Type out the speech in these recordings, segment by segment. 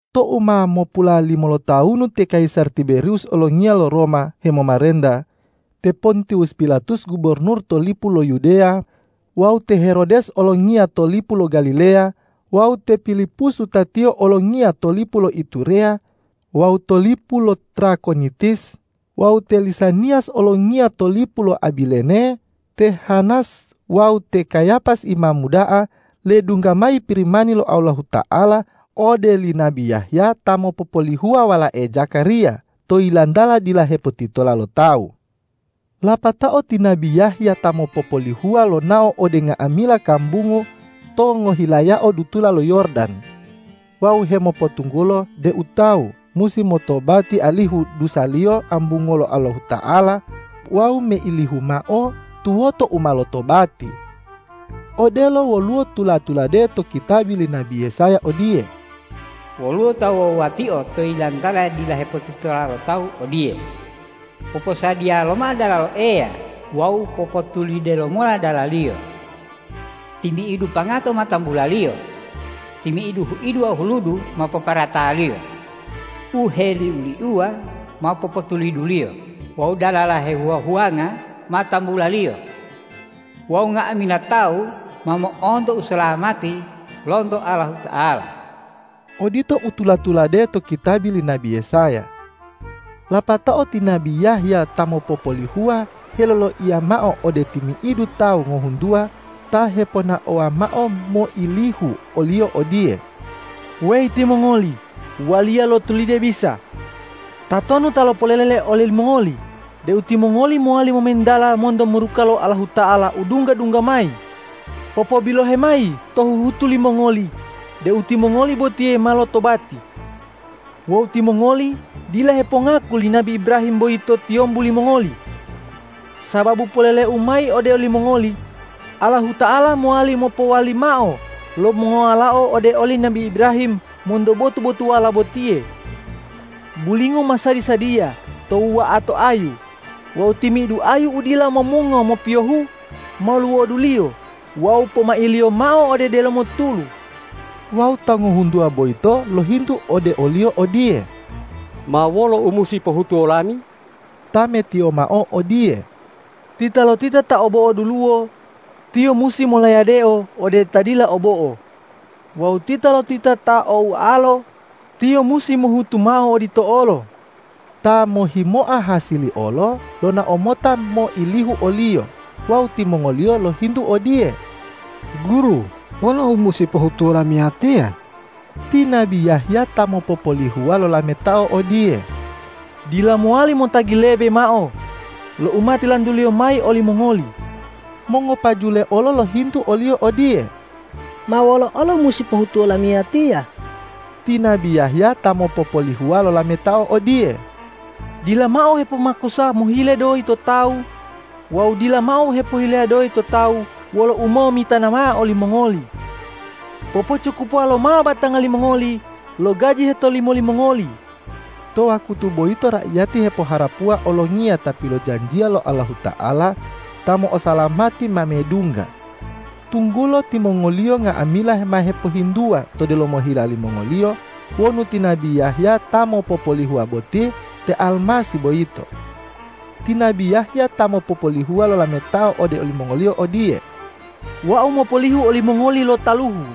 Tou ma mopulalimo lotawunu ti kayisar Tiberiwus olongiya lo Roma hemomarenta, te Pontiwus Pilatus gubornur to lipu lo Yudeya, wawu te Herodes olongiya to lipu lo Galileya, wawu te Pilipus wutatiyo olongiya to lipu lo Itureya wawu to lipu lo Trakonitis wawu te Lisaniyas olongiya to lipu lo Abilene, te Hanas wawu te Kayapas imamu da'a, ledungga mayi Pirimani lo Allahuta'ala ode li nabi Yahya ta mopopolihuwa walae Zakariya, to yilantala dila hepotitola lo tawu. Lapatao ti nabi Yahya ta mopopolihuwa lonao ode nga'amila kambungu to ngohilayao dutula lo Yordan wawu hemopotunggulo deu tawu musi motobati alihu dusaliyo ambunguwo lo Allahuta'ala wawu meilihu mao tuwoto u ma lotobati. Odelo woluwo tula-tulade to kitabi li nabi Yesaya odiye,”Woluwo ta wuwa-wuwatio to yilantala dila hepotitola lo tawu odiye, ’Poposadiya lomao dalalo Eya wawu popotulide lomola dala-Liyo. Timi'idu pangato ma tambulaliyo, timi'idu huidu wawu huludu ma poporataliyo, u heliu-liuwa ma popotuliduliyo wawu dalala hehuwa-huwanga ma tambulaliyo. Wawu nga'amila tawu ma mo'onto usalamati lonto Allahuta'ala!’” Odito u tula-tulade to kitabi li nabi Yesaya. Lapatao ti nabi Yahya ta mopopolihuwa heloloiya mao ode timi'idu tawu ngohuntuwa ta heponaowa mao moilihu oliyo odiye,”Weyi timongoli, waliya lo tulide bisa! Tatonu ta lopolele olimongoli deu timongoli mowali momentala monto muruka lo Allahuta'ala u dungga-dungga mayi? Popobilohe mayi to huhutu limongoli deu timongoli botiye ma lotobati. Wawu timongoli dila hepongaku li nabi Ibrahim boyito tiyombu limongoli! Sababu poleleu mayi ode olimongoli: Allahuta'ala mowali mopowali mao lo mongowalao ode oli nabi Ibrahim monto botu-botuwala botiye. Bulingo ma sadi-sadiya to wuwa'ato ayu wawu timi'idu ayu u dila momungo mopiyohu ma luwoduliyo wawu pomailiyo mao ode delomo tulu.” Wawu tawu ngohuntuwa boyito lohintu ode oliyo odiye,”Ma wolo u musi pohutuwo lami?” Tametiyo mao odiye,”Titalotita ta o bo'o duluwo, tiyo musi molayadeo ode ta dila o bo'o; wawu titalotita ta o ualo, tiyo musi mohutu mao odito olo.” Ta mohhimoa hasili olo lonao mota moilihu oliyo wawu timongoliyo lohintu odiye,”Guru, wolo u musi pohutuwo lamiyatiya?” Ti nabi Yahya ta mopopolihuwa lolametao odiye,”Dila mowali motagi lebe mao lo u ma tilantuliyo mayi olimongoli.” Mongopajule olo lohintu oliyo odiye,”Ma wolo olo musi pohutuwo lamiyatiya?” Ti nabi Yahya ta mopopolihuwa lolametao odiye,”Dila mao hepomakusa mohile doyi to tawu wawu dila mao hepohile doyi to tawu wolo umomitana mao olimongoli. Popocukupuwa lomao batanga limongoli lo gaji hetolimo limongoli!” To wakutu boyito raiyati hepoharapuwa Olongiya ta pilojanjiya lo Allahuta'ala ta mo'osalamati ma medungga, tunggulo timongoliyo nga'amila ma hepohintuwa to delomo hila limongoliyo wonu ti nabi Yahya ta mopopolihuwa boti te Almasih boyito. Ti nabi Yahya ta mopopolihuwa lolametao ode olimongoliyo odiye,”Wau mopolihu olimongoli lo taluhu,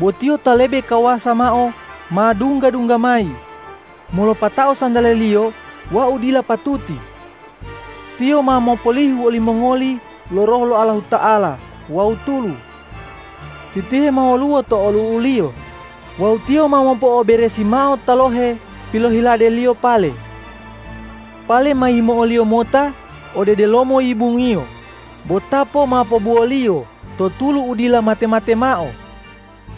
bo Tiyo ta lebe kawasau mao ma dungga-dungga mayi, molopatao santale-Liyo wau dila patuti. Tiyo ma mopolihu olimongoli lo Roh lo Allahuta'ala wawu tulu. Titihe ma woluwo to olu'u-Liyo wawu Tiyo ma mopo'oberesi mao talohe pilohilade-Liyo pale. Pale ma yimo'o-Liyo mota ode delomo yibung-Iyo, bo tapo ma pobuwo-Liyo to tulu u dila mate-mate mao!”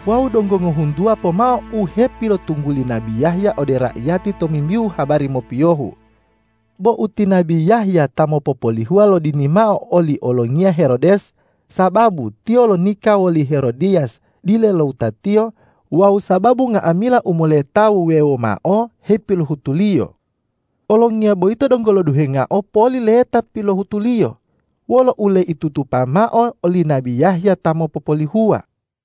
Wawu donggo ngohuntuwa pomao u hepilopotungguli nabi Yahya ode raiyati tomimbihu habari mopiyohu. Bo tou ti nabi Yahya ta mopopolihuwa lodini mao oli olongiya Herodes sababu tiyo lonika woli Herodiyas dile lo wutatiyo wawu sababu nga'amila u moleta wuwewo mao hepilohutuliyo, olongiya boyito donggo loduhengao poli leta pilohutuliyo wolo uleitutupa mao oli nabi Yahya ta mopopolihuwa.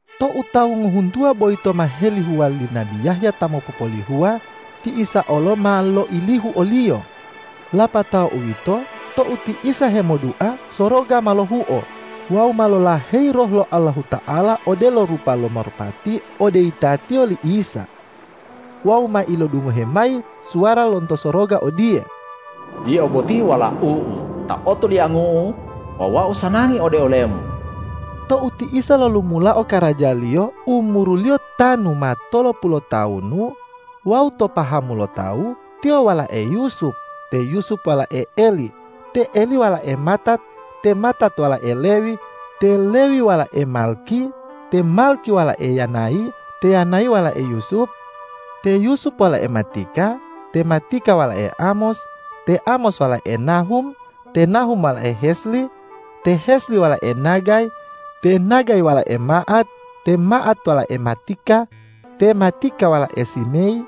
Tou tawu ngohuntuwa boyito ma helihuwa li nabi Yahya ta mopopolihuwa, ti Isa olo ma loilihu oliyo. Lapatao uwito tou ti Isa hemodua, soroga ma lohuo wawu ma lolaheyi Roh lo Allahuta'ala odelo rupa lo marupati ode yitatiyo li Isa. Wawu ma ilodungohe mayi suwara lonto soroga odiye,”Yio boti Walau-U ta otoliangu-U wawu Wau sanangi ode ole-Mu.” Tou ti Isa lolumulao karaja-Liyo, umuru-Liyo tanu ma tolopulu lotawunu wawu to pahamu lo tawu Tiyo walae Yusup, te Yusup walae Eli, te Eli walae Matat, te Matat walae Lewi, te Lewi walae Malkhi, te Malkhi walae Yanayi, te Yanayi walae Yusup, te Yusup walae Matika, te Matika walae Amos, te Amos walae Nahum, te Nahum walae Hesli, te Hesli walae Nagai, te Nagai walae Ma'at, te Ma'at walae Matika, te Matika walae Simeyi,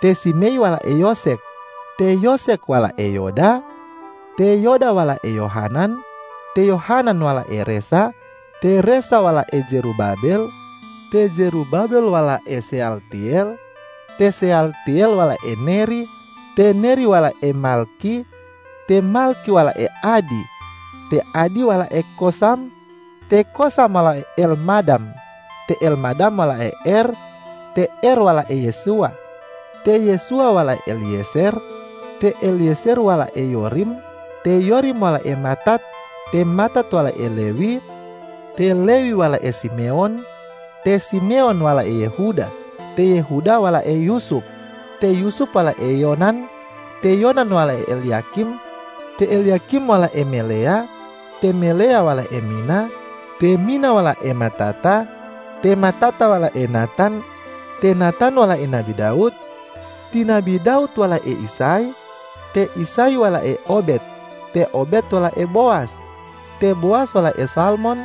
te Simeyi walae Yosekh, te Yosekh walae Yoda, te Yoda walae Yohanan, te Yohanan walae Resa, te Resa walae Zerubabel, te Zerubabel walae Seyaltiyel, te Seyaltiyel walae Neri te Neri walae Malkhi, te Malkhi walae Adi, te Adi walae Kosam, te Kosam walae Elmadam, te Elmadam walae Er, te Er walae Yesuwa, te Yesuwa walae Eliyezer, te Eliyezer walae Yorim, te Yorim walae Matat, te Matat walae Lewi, te Lewi walae Simewon, te Simewon walae Yehuda, te Yehuda walae Yusup, te Yusup walae Yonan, te Yonan walae Elyakim te Elyakim walae Meleya, te Meleya walae Mina, te Mina walae Matata, te Matata walae Natan, te Natan walai nabi Dawud, ti nabi Dawud walae Isay, te Isay walae Obed, te Obed walae Bowas, te Bowas walae Salmon,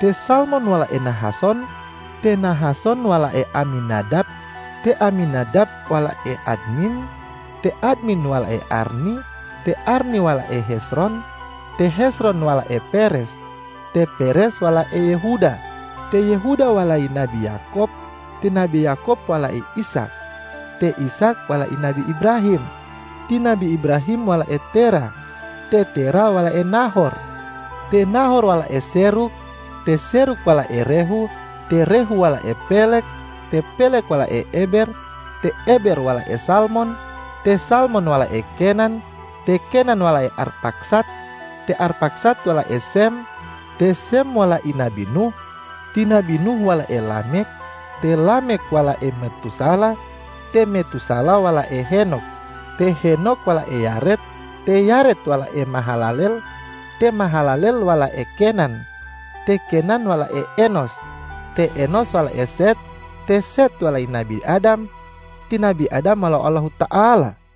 te Salmon walae Nahason, te Nahason walae Aminadab, te Aminadab walae Admin, te Admin walae Arni, te Arni walae Hezron, te Hezron walae Peres, te Peres walae Yehuda, te Yehuda walai nabi Yakob, ti nabi Yakob walae Ishak, te Ishak walai nabi Ibrahim, ti nabi Ibrahim walae Terah, te Terah walae Nahor, te Nahor walae Serug, te Serug walae Rehu, te Rehu walae Peleg, te Peleg walae Eber, te Eber walae Salmon, te Salmon walae Kenan, te Kenan walae Arpaksad, te Arpaksad walae Sem, te Sem walai nabi Nuh, ti nabi Nuh walae Lamekh, te Lamekh walae Metusalah, te Metusalah walae Henok, te Henok walae Yared, te Yared walae Mahalalel, te Mahalalel walae Kenan, te Kenan walae Enos, te Enos walae Set, te Set walai nabi Adam, ti nabi Adam walao Allahuta'ala.